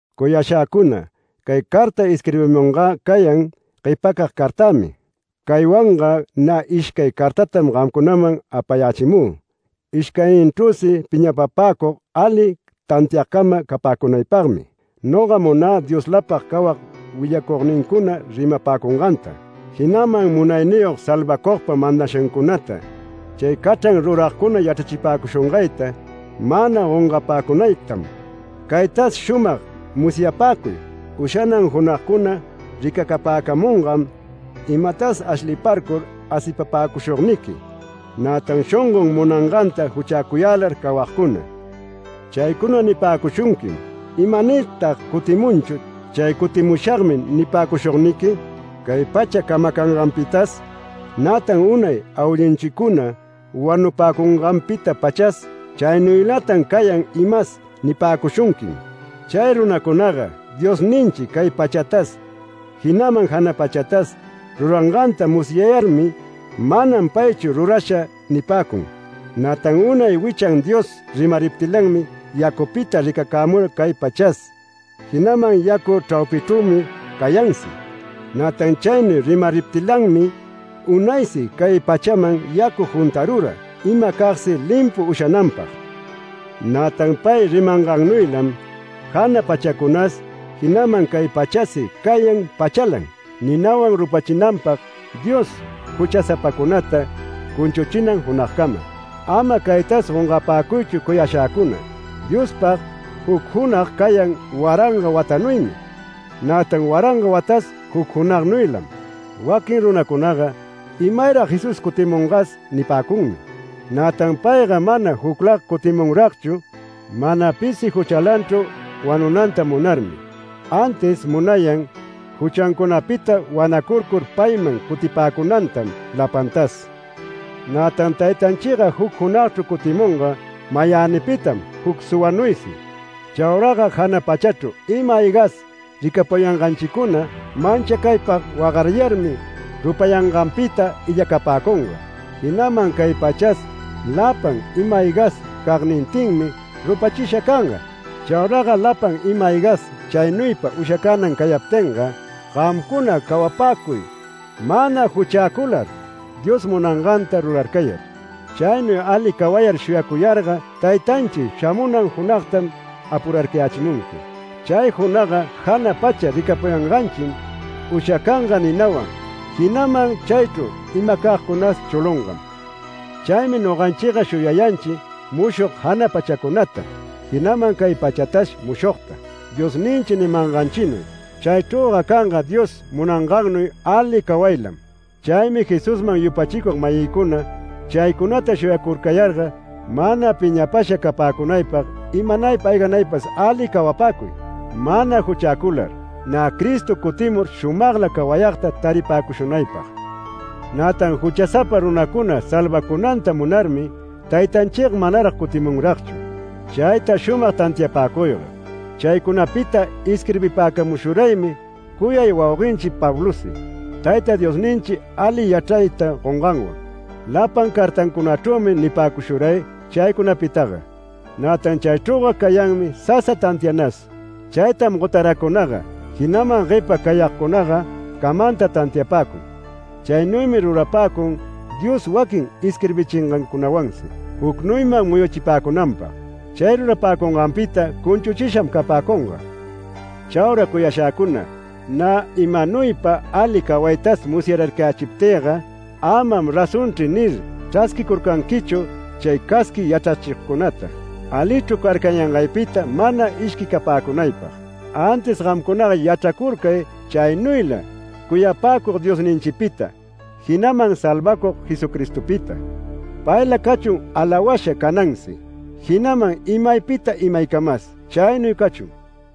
Cuyashäcuna, cay carta isquirbimungä cayan guepacag cartämi. Caywanga nä ishcay cartatam gamcunaman apayächimü. Ishcayninchrüsi piñapapäcug ali tantiagcama capäcunaypagmi. Noga munä Dioslapag cawag willacugnincuna rimapäcunganta, jinaman Munayniyog Salvacugpa mandashancunata chay cachran ruragcuna yachrachipäcushungayta mana gongapäcunaytam. Caytas shumag musyapäcuy: Ushanan junagcuna ricacapäcamungam imatas ashliparcur asipapäcushugniqui, nätan shongon munanganta juchäcuyälar cawagcuna. Chaycuna nipäcushunquim: ¿Imanirtag cutimunchu chay “Cutimushagmi” nipäcushugniqui? “Cay pacha camacanganpitas, nätan unay awillunchicuna wanupäcunganpita-pachas chaynuylatan cayan imas” nipäcushunquim. Chay runacunaga Diosninchi cay pachatas jinaman jana pachatas ruranganta musyayarmi “Manam paychu rurasha” nipäcun. Nätan unay wichan Dios rimariptilanmi yacupita ricacämura cay pachas. Jinaman yacu chraupinchrümi cayansi. Nätan chaynuy rimariptilanmi unaysi cay pachaman yacu juntarura imacagsi limpu ushananpag. Nätan pay rimangannuylam jana pachacunas jinaman cay pachasi cayan pachalan, ninawan rupachinanpag Dios juchasapacunata cunchuchinan junagcama. Ama caytas gongapäcuychu cuyashäcuna. Diospag juc junag cayan waranga watanuymi; nätan waranga watas juc junagnuylam. Waquin runacunaga “¿Imayrag Jesús cutimungas?” nipäcunmi. Nätan payga mana juclaga cutimunragchu, mana pisi juchalanchu wanunanta munarmi, antis munayan juchancunapita wanacurcur payman cutipäcunantam lapantas. Nätan Taytanchiga juc junagchru cutimunga mayänipitam juc suwanuysi. Chauraga jana pachachru ima-aygas ricapuyanganchicuna manchacaypag wagariyarmi rupayanganpita illacapäcunga. Jinaman cay pachas lapan ima-aygas cagnintinmi rupachisha canga. Chauraga lapan ima-aygas chaynuypa ushacänan cayaptinga, gamcuna cawapäcuy mana juchäcular, Dios munanganta rurarcayar. Chaynuy ali cawayar shuyacuyarga Taytanchi shamunan junagtam apurarcayächimunqui. Chay junagga jana pacha ricapuyanganchim ushacanga ninawan jinaman chaychru imacagcunas chulungam. Chaymi noganchiga shuyayanchi mushog jana pachacunata, jinaman cay pachatas mushogta, Diosninchi nimanganchinuy. Chaychrüga canga Dios munangannuy ali cawaylam. Chaymi Jesusman yupachicug-mayïcuna, chaycunata shuyacurcayarga, mana piñapasha capäcunaypag imanaypa ayganaypas ali cawapäcuy, mana juchäcular, nä Cristo cutimur shumagla cawayagta taripäcushunaypag. Nätan juchasapa runacuna salvacunanta munarmi Taytanchiga manarag cutimunragchu. Chayta shumag tantiapäcuyga. Chaycunapita isquirbipäcamushuraymi cuyay wauguenchi Pablosi, Tayta Diosninchi ali yachrayta gonganwan. Lapan cartancunachrümi nipäcushuray chaycunapitaga. Nätan chaychrüga cayanmi sasa tantianas. Chaytam gotaracunaga, jinaman guepa cayagcunaga camanta tantiapäcun. Chaynuymi rurapäcun Dios waquin isquirbichingancunawansi jucnuyman muyuchipäcunanpag. Chay rurapäcunganpita cunchuchisham capäcunga. Chaura cuyashäcuna, nä imanuypa ali cawaytas musyararcayächiptïga “Amam razonchri” nir chrasquicurcanquichu chay casqui yachrachigcunata, alichru carcayangaypita mana ishquicapäcunaypag. Antis gamcunaga yachracurcay chaynuyla cuyapäcug Diosninchipita, jinaman Salvacug Jesucristopita. Payla cachun alawasha canansi, jinaman imaypita imaycamas. Chaynuy cachun.